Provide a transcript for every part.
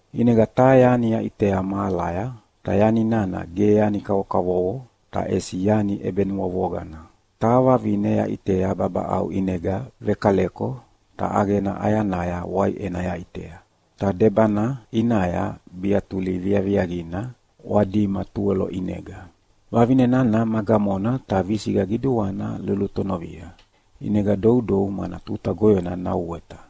ʼInega taha yani yaʼitea mahalaya, ta yani nana ge yani kavokavovo ta ʼesi yani ʼebenuavoqana. Taha vavine yaʼitea babaʼau ʼinega vekaleko, ta ʼaqena ʼayanaya waiʼena yaʼitea, ta debana ʼinaya biatuli viaviaqina ʼwadima tuwelo ʼinega. Vavine nana ma gamona ta visiqa qiduana lulutonovia, ʼinega doudou mana tuta goyona nauweta.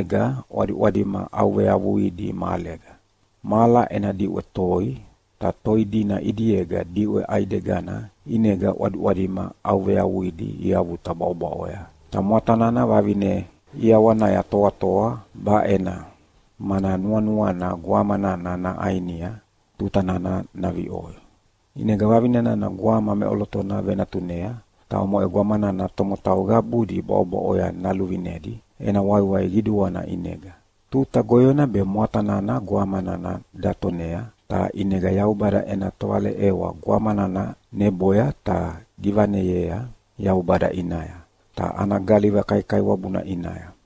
Ta yiqunega ʼwadiʼwadima ʼauveavuidi mahalega. Mahala ena diʼwe toi, ta toi dina ʼidiega diʼwe ʼaidegana ʼinega ʼwadiʼwadima ʼauveavuidi iavuta bwaʼobwaʼoya. Ta mwata nana vavine ʼiawanaya toatoa baʼena, mana nuanuana gwama nana naʼainia tuta nana naviʼoi. ʼInega vavine nana gwama meʼolotona venatunea, ta omoʼe gwama nana tomotau qabudi bwaʼobwaʼoya naluvinedi ena waiwai qiduana ʼinega. Tuta goyona be mwata nana gwama nana datonea, ta ʼinega Yaubada ena tovaleʼewa gwama nana neboya ta givaneyea Yaubada ʼinaya, ta ana galiva kaikaiwabuna ʼinaya.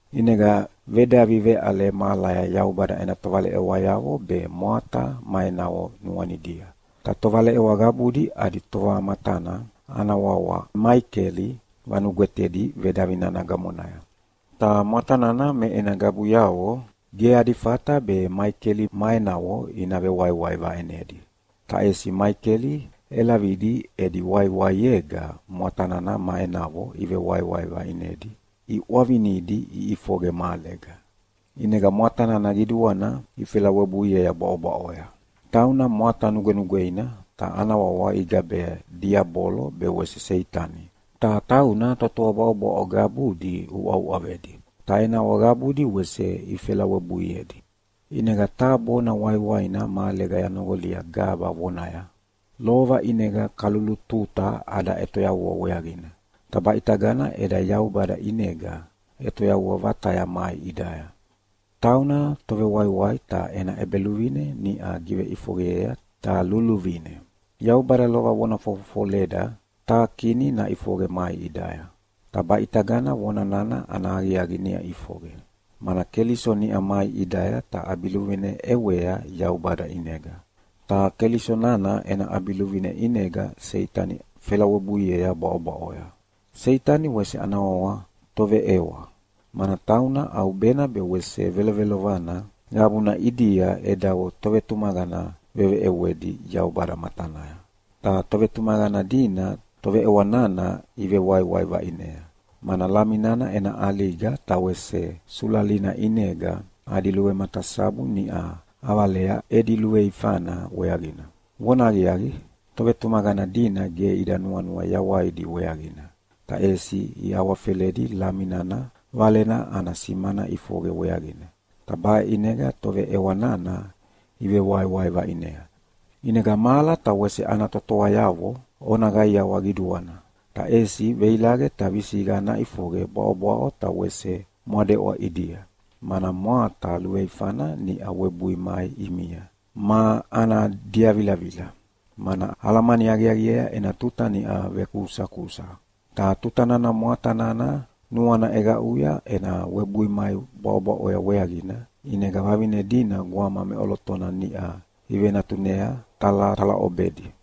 ʼInega vedavi veʼale mahalaya Yaubada ena tovaleʼewayavo be mwata ma enavo nuanidia. Ta tovaleʼewa qabudi adi tovamatana ana wawa Maikeli vanugwetedi vedavi nana gamonaya. Ta mwata nana me ena qabuyavo ge adi fata be Maikeli ma enavo ina vewaiwai vaʼinedi. Ta ʼesi Maikeli ʼelavidi edi waiwaiega mwata nana ma enavo iʼwavinidi iʼifoqe mahalega. ʼInega mwata nana qiduana ifelawebuiea bwaʼobwaʼoya. Tauna mwata nugwenugweina, ta ana wawa igabea Diabolo be wese Seitani, ta tauna totoa bwaʼobwaʼo qabudi uʼauʼavedi. Ta enavo qabudi wese ifelawebuiedi. ʼInega taha bona waiwaina mahalega yanoqolia gaba vonaya, “Lova ʼinega kalulututa ada ʼetoyavua weaqina, ta baʼitagana eda Yaubada ʼinega ʼetoyavua vataya mai ʼidaya. Tauna Tovewaiwai ta ena ʼEbeluvine niʼa giveʼifoqeyea ta luluvine. Yaubada lova vona fofofoleda taha Kini naʼifoqe mai ʼidaya, ta baʼitagana vona nana ana aqiaqi niʼa ʼifoqe, mana Keliso niʼa mai ʼidaya ta ʼabiluvine ʼewea Yaubada ʼinega. Ta Keliso nana ena ʼabiluvine ʼinega Seitani felawebuiea bwaʼobwaʼoya. Seitani wese ana wawa Toveʼewa, mana tauna ʼaubena be wese velovelovana qabuna ʼidia edavo tovetumaqana veveʼewedi Yaubada matanaya. Ta tovetumaqana dina toveʼewa nana ivewaiwai vaʼinea, mana Lami nana ena ʼaliga ta wese sulalina ʼinega adi luvematasabu niʼa ʼavalea edi luveifana weaqina. Vonahaqiaqi, tovetumaqana dina ge ida nuanua yawaidi weaqina, ta ʼesi iawafeledi Lami nana Valena ana simana ʼifoqe weaqina, ta baʼe ʼinega toveʼewa nana ivewaiwai vaʼinea. ʼInega mahala ta wese ana totoayavo ona qaiawa qiduana! Ta ʼesi veilaqe ta visiqa naʼifoqe bwaʼobwaʼo ta wese mwadeʼwa ʼidia, mana mwata luveifana niʼa webui mai ʼimia ma ana diavilavila, mana alamani aqiaqiea ena tuta niʼa vekusakusa.” Ta tuta nana mwata nana nuana ʼeqaʼuya ena webui mai bwaʼobwaʼoya weaqina, ʼinega vavine dina gwama meʼolotona niʼa ivenatunea talatalaʼobedi.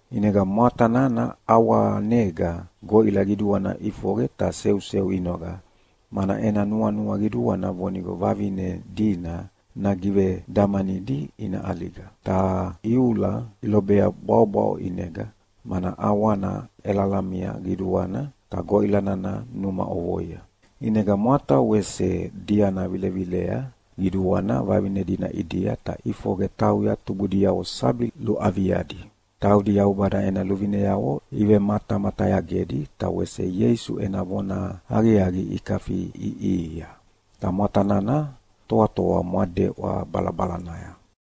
ʼInega mwata nana ʼawanega goʼila qiduana ʼifoqe ta seuseu inoqa, mana ena nuanua qiduana vonigo vavine dina nagivedamanidi ina ʼaliga. Ta iula ilobea bwaʼobwaʼo ʼinega, mana ʼawana ʼelalamia qiduana ta goʼila nana numa ʼovoia. ʼInega mwata wese diana vilevilea qiduana vavine dina ʼidia ta ʼifoqe tauya tubudiavo sabi luaviadi, taudi Yaubada ena luvineavo ivematamatayagedi ta wese Ieisu ena vonahaqiaqi ikafiʼiʼihia. Ta mwata nana toatoa mwadeʼwa balabalanaya.